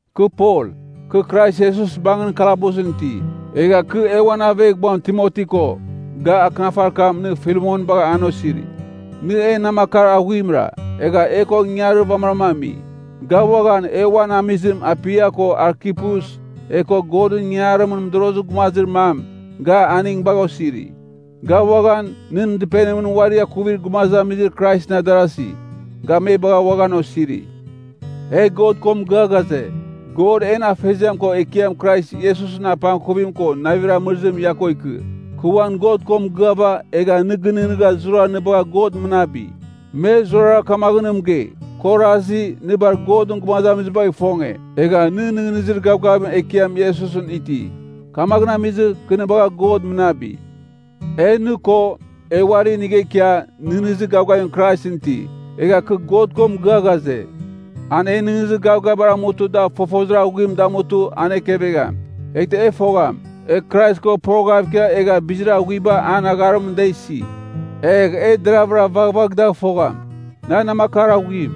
Kɨ Pol, kɨ Krais Iesus bangɨn kalabusɨn iti, egha kɨ e uan aveghbuam Timoti ko, ga akɨnafarir kam nɨ Filemon bagha an osiri. Nɨ en namakar aghuimra, egha e ko ingangarir vamɨram ami. Ga uaghan, e uan amizim Apia ko Arkipus, e ko Godɨn ingangarimɨn mɨdorozir gumazir mam, ga aning bagha osiri. Ga uaghan, nɨn dɨpenimɨn uari akuvir gumazamizir Kraisɨn adarasi, ga me bagha uaghan osiri. E God ko mɨgɨa ghaze, God en Afeziam ko Ekiam Krais Iesusɨn apangkuvim ko navir amɨrɨzim ia ko ikɨ. Kɨ uan God ko mɨgɨava, egha nɨ gɨnɨghnɨgha zurara nɨ bagha God mɨnabi. Me zurara kamaghɨn na mɨgei, kɨ orasi, nɨ bar Godɨn gumazamizibagh ifonge, egha nɨ nɨghnɨzir gavgavim Ekiam Iesusɨn iti. Kamaghɨn amizɨ, kɨ nɨ bagha God mɨnabi. E nɨ ko, e uari inigha ikia, nɨghnɨzir gavgavim Kraisɨn iti. Egha kɨ God ko mɨgɨa ghaze, an e nɨghnɨzir gavgavibar amutɨ da fofozir aghuim damutɨ an ekevegham. Eghtɨ e fogham, e Krais ko poroghav ikia egha bizir aghuiba an agharimɨn da isi. Egh e deravɨra vaghvagh dagh fogham. Nan namakar aghuim,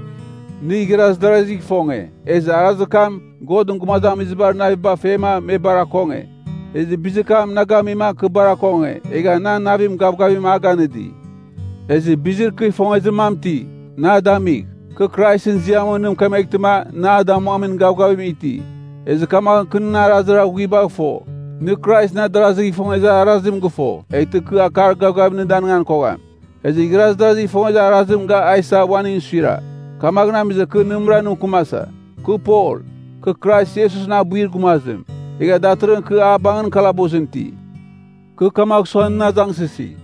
nɨ igharaz darazigh ifonge, ezɨ arazir kam Godɨn gumazamizibar naviba fema me bar akonge. Ezɨ bizir kam na gamima kɨ bar akonge, egha nan navim gavgavim a ganɨdi. Ezɨ bizir kɨ ifongezir mam iti, nɨ a damigh. Kɨ Kraisɨn ziamɨn nɨ mɨkemeghtɨma nɨ a damuamin gavgavim iti. Ezɨ kamaghɨn kɨ nɨn arazir aghuibagh fo, nɨ Kraisɨn adarazigh ifongezir arazim gɨfo, eghtɨ kɨ akar gavgavim nɨ danigan kogham. Ezɨ igharaz darazigh ifongezir arazim ga isa uaningɨn suira, kamaghɨn amizɨma kɨ nɨmɨra nɨ mɨkɨmasa. Kɨ Pol, kɨ Krais Iesusɨn abuir gumazim, egha datɨrɨghɨn kɨ a bangɨn kalabusɨn iti. Kɨ kamagh sua nɨn azangsɨsi,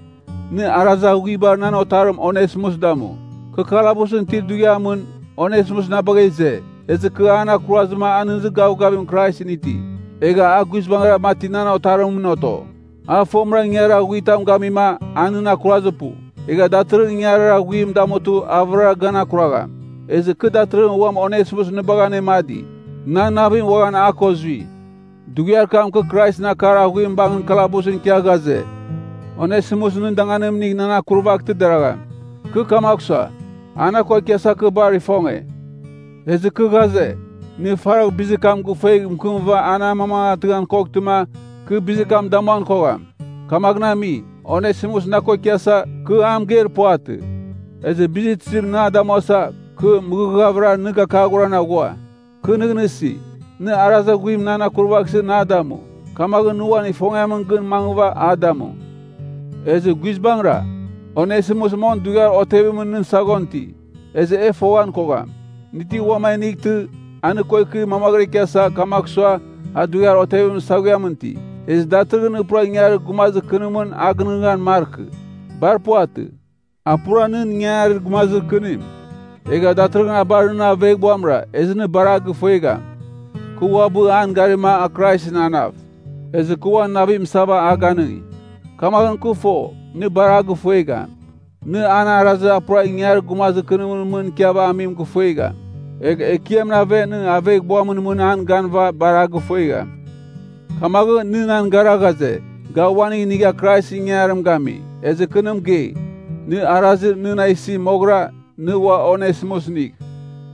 nɨ arazir aghuibar nan otarim Onesimus damu. Kɨ kalabusɨn itir dughiamɨn, Onesimus na bagha ize, ezɨ kɨ an akurazɨma a nɨghnɨzir gavgavim Kraisɨn iti. Egha a guizbangɨra mati nan otarimɨn oto. A fomɨra ingangarir aghuir tam gamima a nɨn akurazir pu. Egha datɨrɨghɨn ingangarir aghuim damutɨ a vɨrara gan akuragham. Ezɨ kɨ datɨrɨghɨn uam Onesimus nɨ bagha anemadi, nan navim uaghan a ko zui. Dughiar kam kɨ Kraisɨn akar aghuim bangɨn kalabusɨn ikia, ghaze, Onesimus nɨn danganim inigh nan akurvaghtɨ deragham. Kɨ kamagh sua, a na ko ikiasa kɨ bar ifonge. Ezɨ kɨ ghaze, nɨ faragh bizir kam gifuegh mɨkɨmɨva an amamangatɨghan koghtɨma, kɨ bizir kam damuan kogham. Kamaghɨn ami, Onesimus na ko ikiasa, kɨ a mɨgeir puvatɨ. Ezɨ bizir tizim nɨ a damuasa, kɨ mɨghɨghvɨra nɨ gakaghoran aghua. Kɨ nɨghnɨsi, nɨ arazir aghuim nan akurvaghsɨ na damu, kamaghɨn nɨ uan ifongiamɨn gɨn mangɨva a damu. Ezɨ guizbangɨra, Onesimus mong dughiar otevimɨn nɨn saghon iti. Ezɨ e foghan kogham, nɨ ti uam a inightɨ, a nɨ ko ikɨ mamaghɨra ikiasa, kamagh sua a dughiar otevimɨn saghuiam iti. Ezɨ datɨrɨghɨn nɨ pura ingangarir gumazir kɨnimɨn a gɨnɨghnɨghan markɨ. Bar puvatɨ. A pura nɨn ingangarir gumazir kɨnim, egha datɨrɨghɨn a bar nɨn aveghbuamra, ezɨ nɨ bar a gɨfuegham. Kɨ uabɨ an garima a Kraisɨn anav, ezɨ kɨ uan navim isava a ganɨngi. Kamaghɨn kɨ fo, nɨ bar a gɨfuegham. Nɨ an arazir a pura ingangarir gumazir kɨnim mɨn ikiava amim gɨfuegham. Egh Ekiamɨn aven nɨ aveghbuamɨn mɨn an ganɨva bar a gɨfuegham. Kamaghɨn nɨ nan gara ghaze, ga uaning inigha Kraisɨn ingangarim gami, ezɨ kɨ nɨ mɨgei, nɨ arazir nɨ na isi moghɨra, nɨ ua Onesimus inigh.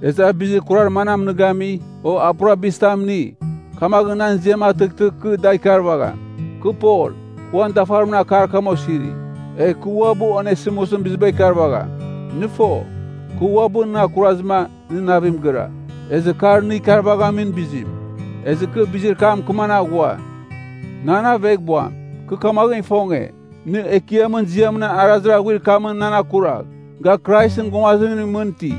Ezɨ a bizir kurar manam nɨ gami, o a pura bizir tam ini, kamaghɨn nan ziam atɨghtɨ kɨ dagh ikarvagham. Kɨ Pol, kɨ uan dafarimɨn akar kam osiri. Egh kɨ uabɨ Onesimusɨn biziba ikarvagham. (Nɨ fo, kɨ uabɨ nɨn akurazɨma, nɨ navim gɨra, ezɨ kar nɨ ikarvaghamin bizim. Ezɨ kɨ bizir kam mɨkɨman aghua.) Nan aveghbuam, kɨ kamaghɨn ifonge, nɨ Ekiamɨn ziamɨn arazir aghuir kamɨn nan akuragh. Ga Kraisɨn gumazimningɨn mɨn iti.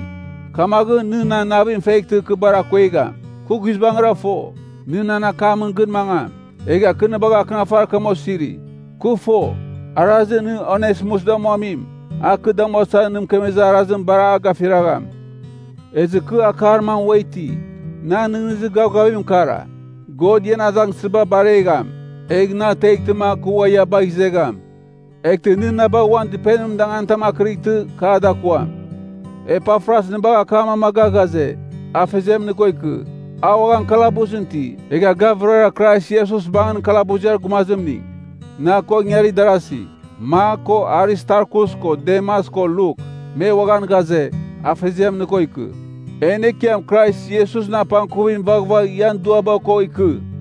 Kamaghɨn nɨ nan navim feghtɨ kɨ bar akuegham! Kɨ guizbangɨra fo, nɨ nan akamɨn gɨn mangam, egha kɨ nɨ bagha akɨnafarir kam osiri. Kɨ fo, arazir nɨ Onesimus damuamim, a kɨ damuasa nɨ mɨkemezir arazim bar a gafiragham. Ezɨ kɨ akar mam ua iti. Nan nɨghnɨzir gavgavim kara, God ian azangsɨziba baregham, egh na ateghtɨma kɨ ua ia bagh izegham. Eghtɨ nɨ na bagh uan dɨpenimɨn danganitam akɨrightɨ, kɨ a dakuam. Epafras nɨ bagha akam amaga ghaze, Afeziam nɨ ko ikɨ. A uaghan kalabusɨn iti, egha ga vɨrara Krais Iesus bangɨn kalabuziar gumazimning. Na ko ingarir darasi, Mak ko Aristarkus ko Demas ko Luk, me uaghan ghaze, Afeziam nɨ ko ikɨ. En Ekiam Krais Iesusɨn apangkuvim vaghvagh ian duaba ko ikɨ.